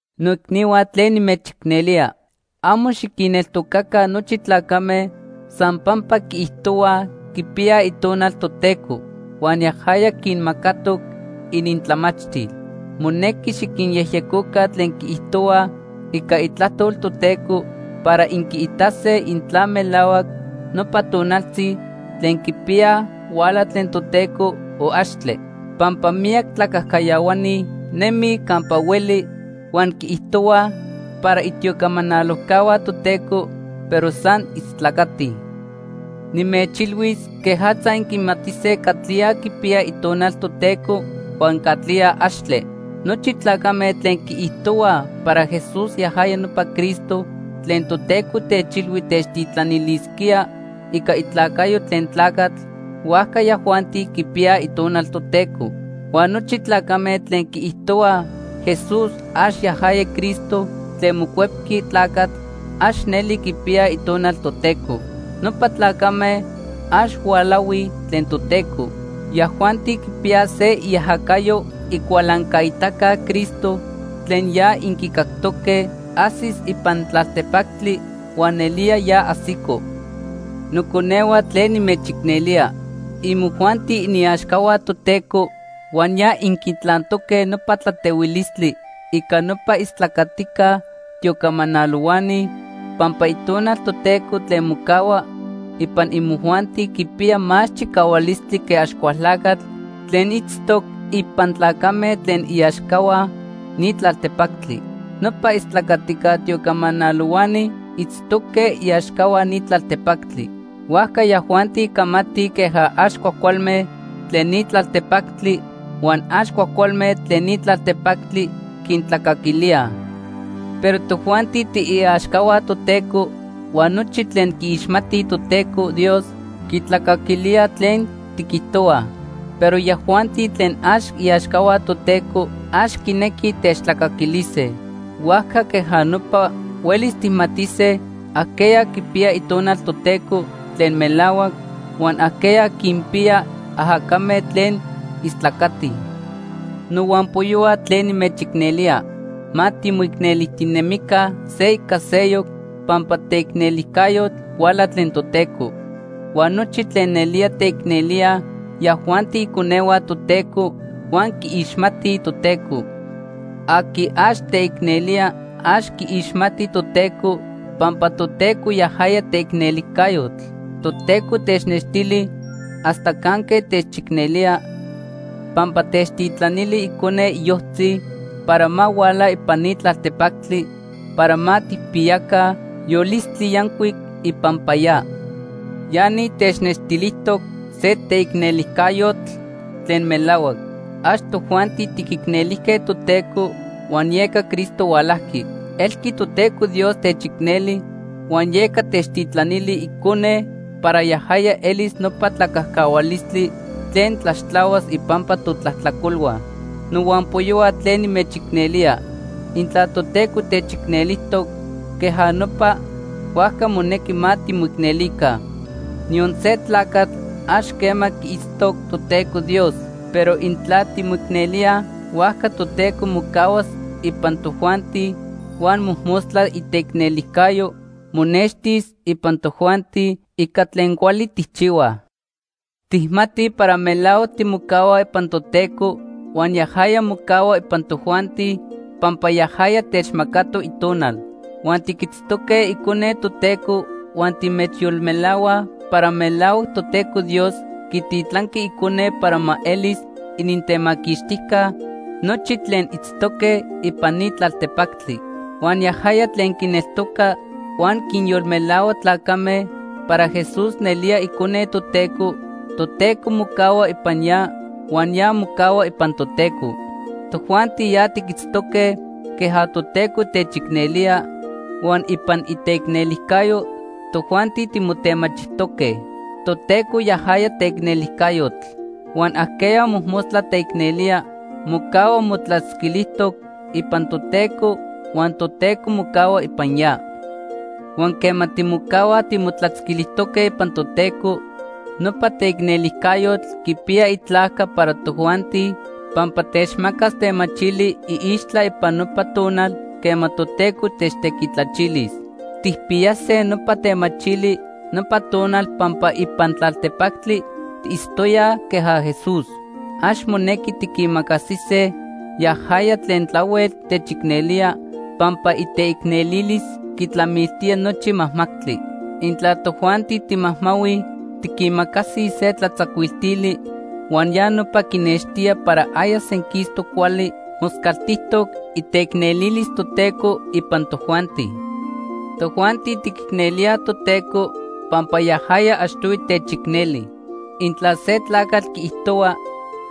Noicnihua tlen nimechicnelía. Amo xiquinneltocaca nochi tlacame san pampa quiijtohuaj quipiyaj Itonal Toteco huan yajaya quinmacatoc inintlamachtil. Monequi xiquinyejyecoca tlen quiijtohuaj ica Itlajtol Toteco para inquiitase intla melahuac nopa tonaltzi tlen quipiyaj huala tlen Toteco, o axtle. Pampa miyac tlacajcayahuani nemij campa hueli, huan quiijtohuaj para itiocamanalojcahua Toteco, pero san istlacatij. Nimechilhuis quejatza inquimatise catlía quipiya Itonal Toteco huan catlía axtle. Nochi tlacame tlen quiijtohuaj para Jesús yajaya nopa Cristo tlen Toteco techilhui techtitlanilisquía ica itlacayo tlen tlacatl, huajca yajuanti quipiyaj Itonal Toteco. Huan nochi tlacame tlen quiijtohuaj Jesús ax yajaya Cristo tlen mocuepqui tlacatl, ax neli quipiyaj Itonal Toteco. Nopa tlacame ax hualahuij tlen Toteco. Yajuanti quipiyaj se iajacayo Icualancaitaca Cristo tlen ya inquicactoque ajsis ipan tlaltepactli huan nelía ya ajsico. Noconehua tlen nimechicnelía, imojuanti iniaxcahua Toteco huan ya inquitlantoque nopa tlatehuilistli ica nopa istlacatica tiocamanalohuani pampa Itonal Toteco tlen mocahua ipan imojuanti quipiya más chicahualistli que Axcualtlacatl tlen itztoc ipan tlacame tlen iaxcahua ni tlaltepactli. Nopa istlacatica tiocamanalohuani itztoque iaxcahua ni tlaltepactli. Huajca yajuanti camatij queja ax cuajcualme tlen ni tlaltepactli, huan ax cuajcualme tlen ni tlaltepactli quintlacaquilíaj. Pero tojuanti tiiaxcahua Toteco, huan nochi tlen quiixmatij Toteco Dios quitlacaquilíaj tlen tiquijtohuaj. Pero yajuanti tlen ax iaxcahua Toteco, ax quinequij techtlacaquilise. Huajca queja nopa huelis tijmatise ajqueya quipiya Itonal Toteco tlen melahuac, huan ajqueya quinpiya ajacame tlen istlacatij. Nohuampoyohua tlen nimechicnelía, ma timoicnelijtinemica se ica seyoc pampa teicnelijcayotl huala tlen Toteco. Huan nochi tlen nelía teicnelíaj, yajuanti iconehua Toteco huan quiixmatij Toteco. Aqui ax teicnelía ax quiixmati Toteco, pampa Toteco, yajaya teicnelijcayotl. Toteco technextili hasta canque techicnelía pampa techtitlanili Icone iyojtzi para ma huala ipan ni tlaltepactli para ma tijpiyaca yolistli yancuic ipampa ya. Ya ni technextilijtoc se teicnelijcayotl tlen melahuac. Ax tojuanti tiquicnelijque Toteco huan yeca Cristo hualajqui. Elqui Toteco Dios techicneli huan yeca techtitlanili Icone para yajaya elis nopa tlacajcahualistli tlen tlaxtlahuas ipampa totlajtlacolhua. Nohuampoyohua tlen nimechicnelía, intla Toteco techicnelijtoc queja nopa, huajca monequi ma timoicnelica. Niyon se tlacatl ax quema quiitztoc Toteco Dios, pero intla timoicnelíaj, huajca Toteco mocahuas ipan tojuanti huan mojmostla iteicnelijcayo monextis ipan tojuanti ica tlen cuali tijchihuaj. Tijmatij para melahuac timocahuaj ipan Toteco huan yajaya mocahua ipan tojuanti pampa yajaya techmacatoc Itonal. Huan tiquitztoque Icone Toteco huan timechyolmelahuaj para melahuac Toteco Dios quititlanqui Icone para ma elis inintemaquixtijca nochi tlen itztoque ipan ni tlaltepactli. Huan yajaya tlen quineltoca huan quinyolmelahua tlacame para Jesús nelía Icone Toteco, Toteco mocahua ipan ya huan ya mocahua ipan Toteco. Tojuanti ya tiquitztoque queja Toteco techicnelía huan ipan iteicnelijcayo tojuanti timotemachijtoque. Toteco yajaya teicnelijcayotl. Huan ajqueya mojmostla teicnelía mocahua motlatzquilijtoc ipan Toteco huan Toteco mocahua ipan ya. Huan quema timocahuaj timotlatzquilijtoque ipan Toteco, nopa teicnelijcayotl quipiya itlajca para tojuanti pampa techmacas temachili iixtla ipan nopa tonal quema Toteco techtequitlachilis. Tijpiyase nopa temachili nopa tonal pampa ipan tlaltepactli tiitztoyaj queja Jesús. Ax monequi tiquimacasise yajaya tlen tlahuel techicnelía, pampa iteicnelilis quitlamiltía nochi majmajtli. Intla tojuanti timajmahuij, tiquimacasij se tlatzacuiltili huan ya nopa quinextía para aya senquistoc cuali moscaltijtoc iteicnelilis Toteco ipan tojuanti. Tojuanti tiquicnelíaj Toteco, pampa yajaya achtohui techicneli. Intla se tlacatl quiijtohua: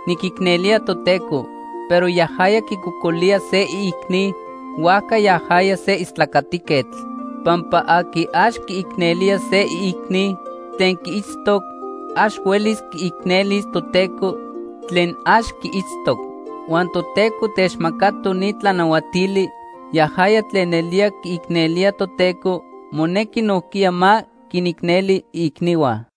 “Niquicnelía Toteco”, pero yajaya quicocolía se iicni, huajca yajaya se istlacatiquetl. Pampa aqui ax quiicnelía se iicni tlen quiitztoc, ax huelis quiicnelis Toteco tlen ax quiitztoc. Huan Toteco techmacatoc ni tlanahuatili: Yajaya tlen nelía quiicnelía Toteco, monequi nojquiya ma quinicneli iicnihua.